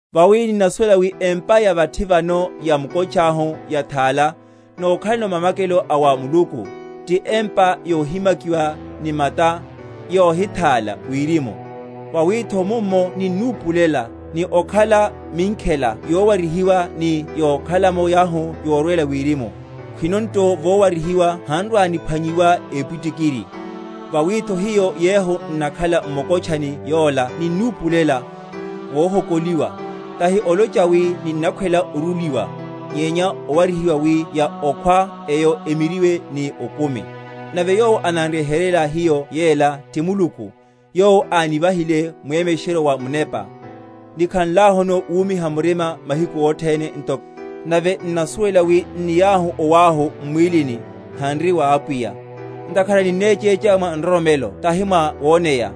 Vawi ninnasuwela wi empa ya vathi vano ya mukotcháhu yathála, nokhalano mamakelo a wa Muluku, ti empa yohimakiwa ni mata, yohithála, wirimu. Vawitho mummo ninnipulela, ni okhala minkhela yowarihiwa ni yokhalamo yauhu yorwela wirimu; khwino nto vowarihiwa han’rwa‐niphwanyiwa épwitikiri. Vawitho hiyo yehu n’nakhala m’mukotchani yola ninnipulela, vohokoliwa; tahi olocha wi ninnakhwela oruliwa, nyenya owarihiwa, wi ya okhwa eyo emiryiwe ni okumi. Nave yowo anan’ryeheryela hiyo yela, ti Muluku, yowo ánivahile mwemesheryo wa Munepa. Nikhanlahuno wumiha murima mahiku othene, nto, nave n’nasuwelahu wi n’niahu owáhu m’mwílini, hanri wa Apwiya: (ntakhara ninnechécha mwa nroromelo tahi mwa woneya);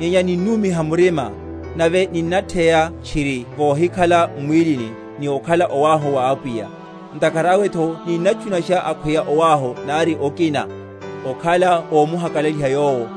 nyenya ninnumiha murima, nave ninnatheya tchiriene vohikhala m’mwílini, ni okhala owáhu wa Apwiya. Ntakhara awetho ninnatchunasha, akhweya owáhu nari okina, okhala ómuhakalaliha Yowo.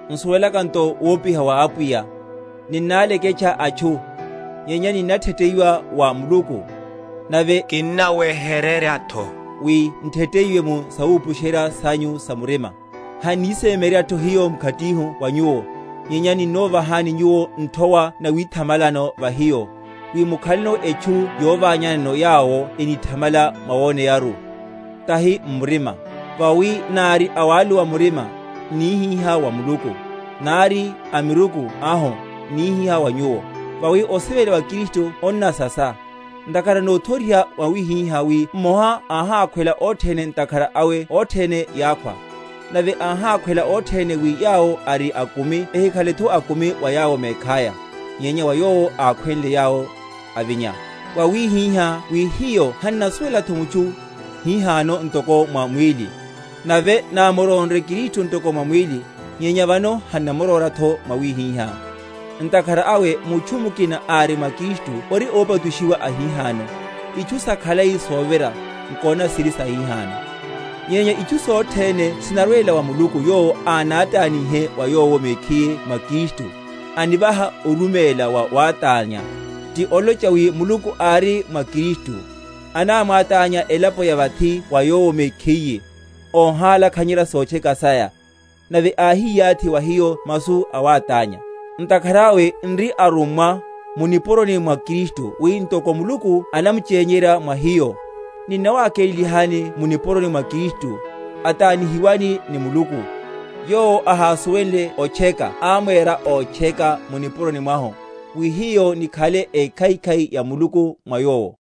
N’suwelaka nto wopiha wa Apwiya, ninnáleketcha atchu, nyenya ninnatheteyiwa wa Muluku; nave kinnaweheryeryatho wi ntheteyiwe mu sawupusherya?-?sanyu‐sa‐murima. Hannisemyeryeryihatho hiyo mkhatihu wa nyuwo, nyenya ninnovahani nyuwo nthowa nawithamalelano va hiyo, wi mukhaleno etchu yoványanano yawo enithamala mwawoneyaru, tahi m’murima. Vawi nári awaluwa murima, n’nihihá wa Muluku; nári a miruku ahu, n’nihihá wa nyuwo. Vawi osivela wa Kristu onnansasa; ntakhara nothoriha mwawihihá wi mmoha áhákhwela othene, ntakhara awe othene yákhwa; Nave áhákhwela othene, wi yawo ari akumi ehikhaletho akumi wa yawo mekhaya, nyenya wa Yowo akhwenle yawo, avinya. Wawihihá wi hiyo hannasuwelatho mutchu hihano ntoko mwa mwíli; nave námurónre Kristu ntoko mwa mwíli, nyenya vano hannamuróratho mwawihihá. Ntakhara awe mutchu mukina ári mwa Kristu ori ópachushiwa ahihano; itchu sakhalai sovira, nkonani, siri sahihano. Nyenya itchu sothene sinarwela wa Muluku yowo ánátánnye wa Yowo mekhiye mwa Kristu, anivaha oruméla wa wátánya; ti olocha wi Muluku ári mwa Kristu, anamwátánya elapo ya vathi wa Yowo mekhiye, óhalakhanyerya sotcheka saya; nave áhiyathi wa hiyo masu a wátánya. Ntakhara awe nri arummwa mu nipuroni mwa Kristu, wi ntoko Muluku anamchenyerya mwa hiyo; ninnawakelelani mu nipuroni mwa Kristu, atanihiwani ni Muluku. Yowo ahasuwenle otcheka amwera otcheka mu nipuroni mwahu; wi hiyo nikhale ekhaikhai ya Muluku mwa Yowo.